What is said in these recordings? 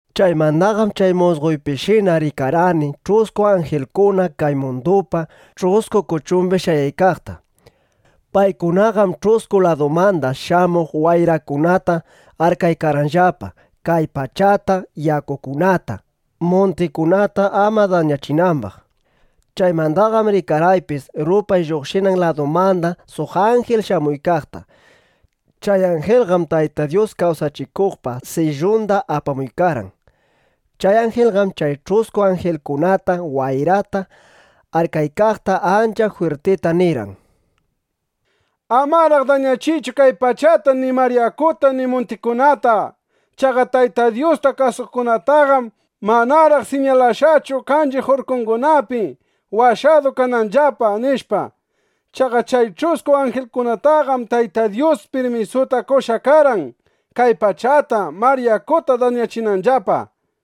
Chaymandaqam chay musqoypishina rikarqani ch'usku anjilkuna kay mundupa ch'usku kuchumbi shayaykaqta. Paykunaqam ch'usku ladumanda shamuq wayrakunata arkaykarqanllapa, kay pachata, yakukunata, muntikunata ama dañachinambaq. Chaymandaqam rikarqaypis rupay lluqshinan ladumanda suq anjil shamuykaqta. Chay anjilqam Tayta Dyus kawsachikuqpa sillunda apamuykarqan. Chay anjilqam chay ch'usku anjilkunata wayrata arkaykaqta ancha jwirtita nirqan: —Amaraq dañachiychu kay pachata ni mar yakuta ni muntikunata. Chaqa Tayta Dyusta kasuqkunataqam manaraq siñalashqachu kanchiq urkungunapi, washadu kananllapa, nishpa. Chaqa chay ch'usku anjilkunataqam Tayta Dyus pirmisuta qoshqa karqan, kay pachata, mar yakuta dañachinanllapa.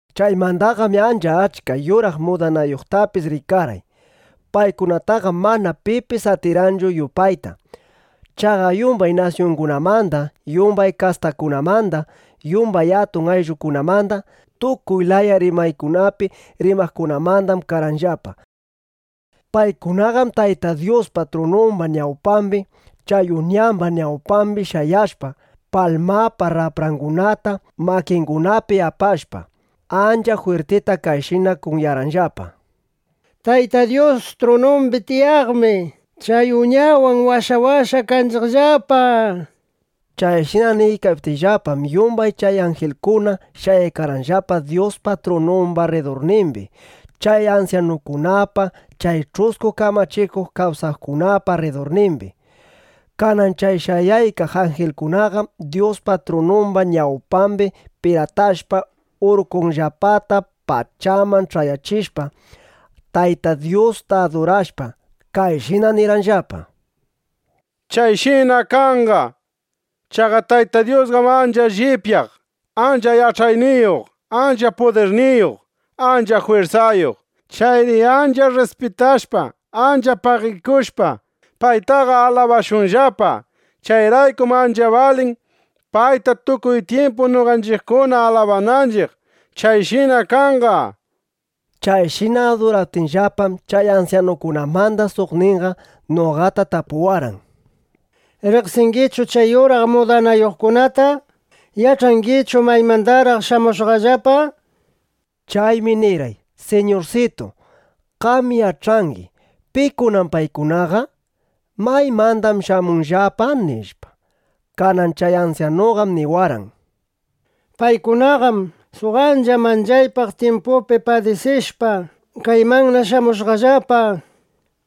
Chaymandaqam ancha achka yuraq mudanayuqtapis rikarqay. Paykunataqam mana pipis atirqanchu yupayta. Chaqa yumbay nasyungunamanda, yumbay kastakunamanda, yumbay atun ayllukunamanda, tukuy laya rimaykunapi rimaqkunamandam karqanllapa. Paykunaqam Tayta Dyuspa trunumba ñawpambi, chay Uñamba ñawpambi shayashpa, palmapa raprangunata makingunapi apashpa, ancha jwirtita kayshina kunyarqanllapa: ¡Tayta Dyus trunumbi tiyaqmi chay Uñawan washawashqa kanchiqllapa! nishpa. Chayshina niykaptinllapam, yumbay chay anjilkuna shayaykarqanllapa Dyuspa trunumba rridurnimbi, chay ansyanukunapa, chay ch'usku kamachikuq kawsaqkunapa rridurnimbi. Kanan chay shayaykaq anjilkunaqam Dyuspa trunumba ñawpambi piratashpa, urkunllapata pachaman ch'ayachishpa, Tayta Dyusta adurashpa, kayshina nirqanllapa: ¡Chayshina kanqa! Chaqa Tayta Dyusqam ancha llipyaq, ancha yach'ayniyuq, ancha pudirniyuq, ancha jwirsayuq. Chayri ancha rrispitashpa, ancha pagikushpa, paytaqa alabashunllapa. Chayraykum ancha balin, payta tukuy tyimpu noqanchiqkuna alabananchiq. Chayshina kanqa, nishpa. Chayshina aduraptinllapam, chay ansyanukunamanda suqninqa noqata tapuwarqan: —¿Riqsingichu chay yuraq mudanayuqkunata? ¿Yach'angichu maymandaraq shamushqallapa? nishpa. Chaymi nirqay: —Siñursitu, qam yach'angi: ¿Pikunam paykunaqa? ¿Maymandam shamushqallapa? nishpa. Kanan chay ansyanuqam niwarqan: —Paykunaqam suq ancha manchaypaq tyimpupi padisishpa, kaymanna shamushqallapa.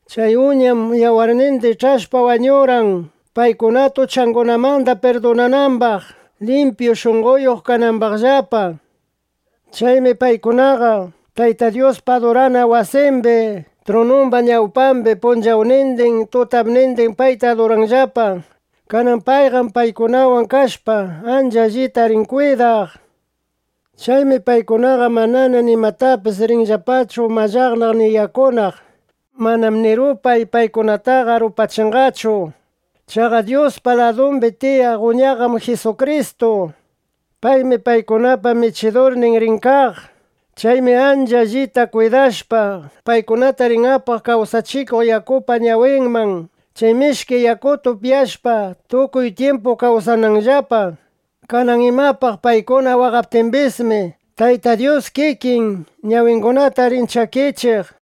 Chay Uñam yawarninda ich'ashpa wañurqan, paykunata uchangunamanda pirdunanambaq, limpyu shunqoyuq kanambaqllapa. Chaymi paykunaqa Tayta Dyuspa adurana wasimbi trunumba ñawpambi punchawnindin tutapnindin payta aduranllapa. Kanan payqam paykunawan kashpa, ancha allita rin kwidaq. Chaymi paykunaqa manana nimatapis rinllapachu mallaqnaq ni yakunaq. Manam ni rupay paykunataqa rupachinqachu. Chaqa Dyuspa ladumbi tiyaq Uñaqam Jisukristu. Paymi paykunapa Michidurninqa rin kaq. Chaymi ancha allita kwidashpa, paykunata rin apaq kawsachikuq yakupa ñawinman, chay mishki yakuta upyashpa, tukuy tyimpu kawsananllapa. Kanan imapaq paykuna waqaptimbismi, Tayta Dyus kikin, ñawingunata rin chakichiq, nishpa.